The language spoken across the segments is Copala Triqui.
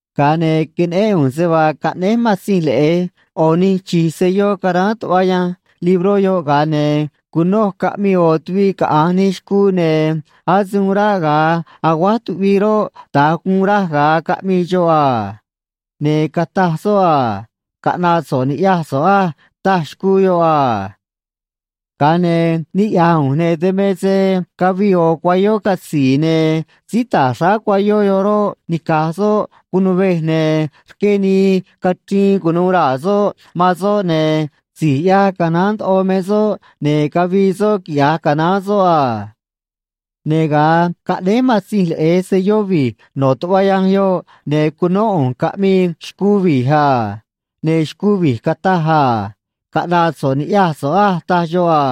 Ga̱a ne̱ queneꞌén ꞌu̱nj se vaa caꞌnéj Matzinj Leꞌe̱j ꞌo̱ nij chi̱j selló caráán tuꞌva yanj libró yoꞌ, ga̱a ne̱ cunoj caꞌmii ꞌo̱ tuviꞌ caꞌa̱nj nij xcuu, ne̱ ase uun ráꞌ ga̱a aguáj tuꞌvii roꞌ, da̱nj guun raj ga̱a caꞌmii xoꞌ a. Ne̱ cataj soꞌ a: ―Caꞌna̱ꞌ so̱ꞌ ni̱ꞌyaj so̱ꞌ á ―taj xcuu yoꞌ a. Ga̱a ne̱ niꞌya̱j ꞌu̱nj, ne̱ dan me se cavii ꞌo̱ cuayó catzi̱i̱, ne̱ síí ta̱j xráá cuayó yoꞌ roꞌ, nica̱j soꞌ cunuvej, ne̱ rqué nii cachriin cu̱nuû raa̱ soꞌ man soꞌ, ne̱ si̱j ꞌyaj canaán ndoꞌo me soꞌ, ne̱ cavii soꞌ quiꞌya̱j canaán soꞌ a. Ne̱ ga̱a caꞌnéj Matzinj Leꞌe̱j selló vi̱j no̱ tuꞌva yanj yoꞌ, ne̱ cunó ꞌu̱nj caꞌmii xcuu vi̱j a. Ne̱ xcuu vi̱j cataj a: ―Caꞌna̱ꞌ so̱ꞌ ni̱ꞌyaj so̱ꞌ á ―taj xoꞌ a.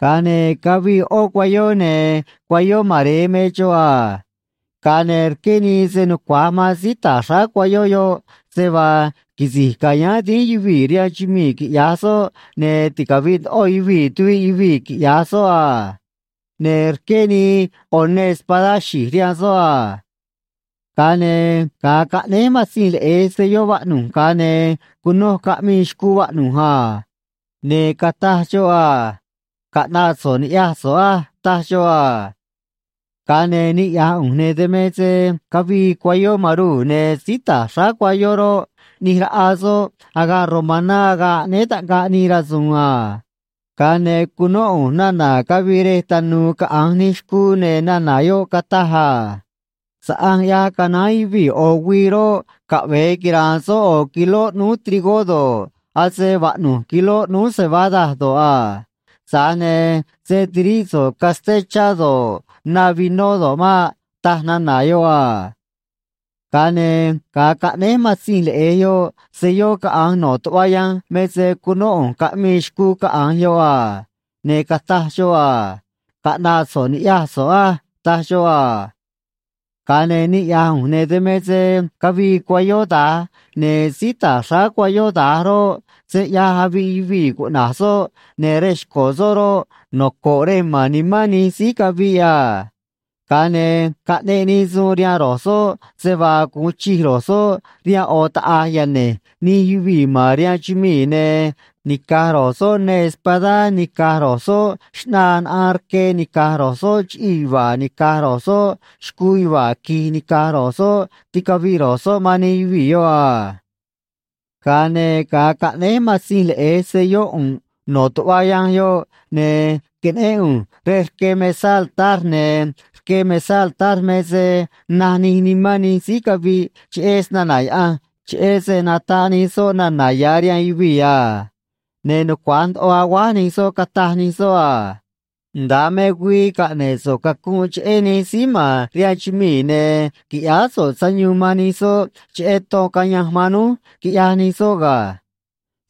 Ga̱a ne̱ cavii ꞌó cuayó, ne̱ cuayó mare̱e me xoꞌ a. Ga̱a ne̱ rqué nii se nucua̱j man síí ta̱j xráá cuayó yoꞌ se vaa quisi̱j cayáán dínj yuvii̱ rihaan chumii̱, quiꞌya̱j soꞌ, ne̱ ticavi̱ꞌ ndoꞌo yuvii̱ tuviꞌ yuvii̱, quiꞌya̱j soꞌ a. Ne̱ rqué nii ꞌo̱ neê espadá xi̱j rihaan soꞌ a. Ga̱a ne̱ ga̱a caꞌnéj Matzinj Leꞌe̱j selló vaꞌnu̱j, ga̱a ne̱ cunoj caꞌmii xcuu vaꞌnu̱j a. Ne̱ cataj xoꞌ a: ―Caꞌna̱ꞌ so̱ꞌ ni̱ꞌyaj so̱ꞌ á ―taj xoꞌ a. Ga̱a ne̱ niꞌya̱j ꞌu̱nj, ne̱ dan me se cavii cuayó maruu̱, ne̱ síí ta̱j xráá cuayó roꞌ, ꞌni̱j raꞌa soꞌ agaꞌ romaná agaꞌ aꞌnéé taꞌngaꞌ nij rasu̱u̱n a. Ga̱a ne̱ cunó ꞌu̱nj nana̱ cavii rej tanu̱u̱ caꞌa̱nj nij xcuu, ne̱ nana̱ yoꞌ cataj a: ―Saꞌanj ꞌyaj canaán yuvii̱ ꞌo̱ güii roꞌ, caꞌve̱e quira̱a̱n soꞌ ꞌo̱ kiló ꞌnúú trigó do̱ꞌ, ase vaꞌnu̱j kiló ꞌnúú cebada do̱ꞌ a. Tza̱j ne̱ se̱ tiríꞌ so̱ꞌ casté chá do̱ꞌ, na vinó do̱ꞌ maꞌ ―taj nana̱ yoꞌ a. Ga̱a ne̱ ga̱a caꞌnéj Matzinj Leꞌe̱j yoꞌ selló caꞌa̱nj no̱ tuꞌva yanj me se cunó ꞌu̱nj caꞌmii xcuu caꞌa̱nj yoꞌ a. Ne̱ cataj xoꞌ a: ―Caꞌna̱ꞌ so̱ꞌ ni̱ꞌyaj so̱ꞌ á ―taj xoꞌ a. Ga̱a ne̱ niꞌya̱j ꞌu̱nj, ne̱ dan me se cavii cuayó da̱j, ne̱ síí ta̱j xráá cuayó da̱j roꞌ, Se ꞌYaj Aviꞌ Yuvii̱ cuꞌna̱j soꞌ, ne̱ rej xco̱ soꞌ roꞌ, noco̱ꞌ Rej Ma̱n Nimán Nij Síí Caviꞌ a. Ga̱a ne̱ caꞌneꞌ nii suun rihaan ro̱j soꞌ se vaa gu̱un chij ro̱j soꞌ rihaan ꞌo̱ taꞌa̱j yane̱j nij yuvii̱ ma̱n rihaan chumii̱, ne̱ ni̱caj ro̱j soꞌ neê espadá ni̱caj ro̱j soꞌ xꞌnaa naꞌaan rque ni̱caj ro̱j soꞌ chiꞌii̱ yuva̱a̱ ni̱caj ro̱j soꞌ xcuu yuva̱a̱ qui̱j ni̱caj ro̱j soꞌ, ticavi̱ꞌ ro̱j soꞌ man nij yuvii̱ yoꞌ a. Ga̱a ne̱ ga̱a caꞌnéj Matzinj Leꞌe̱j selló ꞌu̱nꞌ no̱ tuꞌva yanj yoꞌ, ne̱ queneꞌén ꞌu̱nj rej rque mesá altar, ne̱ rque mesá altar me se naj nij nimán nij síí caviꞌ cheꞌé snana̱ Yaꞌanj cheꞌé se nataꞌ nij soꞌ nana̱ ya̱ rihaan yuvii̱ a. Ne̱ nucua̱j ndoꞌo aguáj nij soꞌ, cataj nij soꞌ a: ―Nda̱a me güii caꞌne̱ꞌ so̱ꞌ cacunꞌ cheꞌé nij síí ma̱n rihaan chumii̱, ne̱ qui̱ꞌyáá so̱ꞌ sayuun man nij soꞌ cheꞌé ton cayanj man núj quiꞌyaj nij soꞌ ga̱.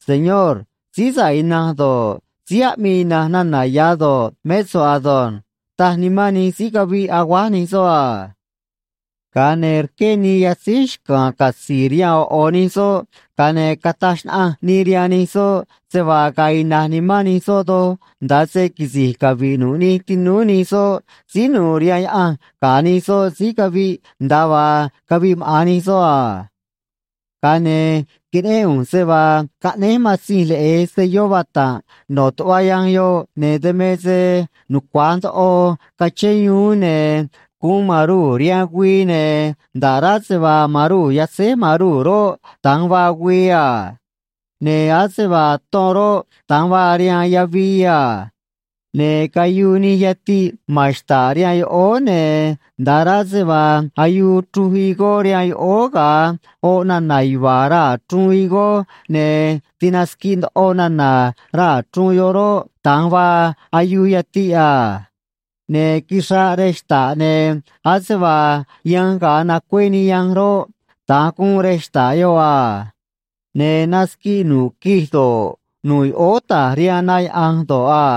Señor, síí sa̱ꞌ ina̱nj do̱ꞌ, síí aꞌmii ina̱nj nana̱ ya̱ do̱ꞌ, mé so̱ꞌ ado̱nj ―taj nimán nij síí caviꞌ, aguáj nij soꞌ a. Ga̱a ne̱ rqué nii yatzíj xca̱a̱n catzi̱i̱ rihaan ꞌo̱ ꞌo̱ nij soꞌ, ga̱a ne̱ cataj xnaꞌanj nii rihaan nij soꞌ se vaa ga̱a̱ ina̱j nimán nij soꞌ doj nda̱a se quisi̱j cavi̱ꞌ nu̱ꞌ nij tinúú nij soꞌ síí nu̱u̱ rihaan Yaꞌanj ga̱ nij soꞌ síí cavi̱ꞌ nda̱a vaa caviꞌ maꞌa̱n nij soꞌ a. Ga̱a ne̱ queneꞌén ꞌu̱nj se vaa caꞌnéj Matzinj Leꞌe̱j selló vata̱nꞌ no̱ tuꞌva yanj yoꞌ, ne̱ dan me se nucua̱j ndoꞌo cachén yuún, ne̱ guun maruu̱ rihaan güii, ne̱ nda̱ꞌ rá se vaa maruu̱ yatzéj maruu̱ roꞌ, da̱nj vaa güii a. Ne̱ ase vaa ton roꞌ, da̱nj vaa rihaan yavii a. Ne̱ cayuu nij yatiꞌ ma̱n xta̱ꞌ rihaan yoꞌóó, ne̱ nda̱ꞌ rá se vaa ayuu chruj higó rihaan yoꞌóó ga̱a oꞌ nana̱ yuva̱a̱ raa̱ chruun higó ne̱ tinasquiꞌ ndoꞌo nana̱ raa̱ chruun yoꞌ roꞌ, da̱nj vaa ayuu yatiꞌ a. Ne̱ quixraꞌ rej xta̱ꞌ, ne̱ ase vaa yanj ga̱a nacué nii yanj roꞌ, da̱nj guun rej xta̱ꞌ yoꞌ a. Ne̱ nasquiꞌ nu̱ꞌ quij do̱ꞌ, nu̱ꞌ yoꞌóó ta̱j rihaan na yaꞌa̱nj do̱ꞌ a.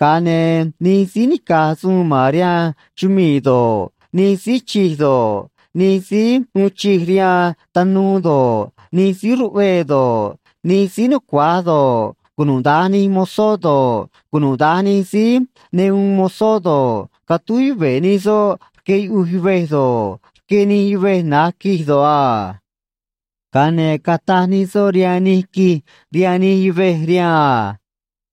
Ga̱a ne̱ nij síí nica̱j suun ma̱n rihaan chumii̱ do̱ꞌ, nij síí chij do̱ꞌ, nij síí uun chij rihaan tanuu do̱ꞌ, nij síí ruꞌvee do̱ꞌ, nij síí nucua̱j do̱ꞌ, cunuda̱nj nij mozó do̱ꞌ, cunuda̱nj nij síí ne uun mozó do̱ꞌ, catúj yuve̱ nij soꞌ rque yuꞌuj yuvej do̱ꞌ, rque nij yuvej na̱j quij do̱ꞌ a. Ga̱a ne̱ cataj nij soꞌ rihaan nij quij rihaan nij yuvej rihaan a: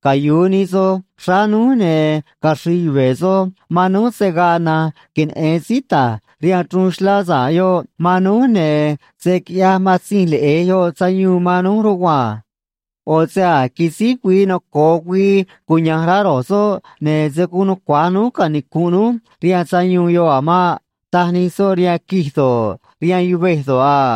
―Cayu̱u nij soj xráá núj, ne̱ caxri̱i̱ yuve̱ soj man núj, se̱ gaa na̱nj queneꞌe̱n síí ta̱j rihaan chruun xlá sa̱ꞌ yoꞌ man núj, ne̱ se̱ quiꞌyaj Matzinj Leꞌe̱j yoꞌ sayuun man núj rugua̱nj. ꞌO̱ se a̱j quisíj güii noco̱o güii cuya̱nj rá ro̱j soꞌ, ne̱ se̱ guun nucua̱j núj canicu̱nꞌ núj rihaan sayuun yoꞌ a̱ maꞌ ―taj nij soꞌ rihaan quij do̱ꞌ, rihaan yuvej do̱ꞌ a.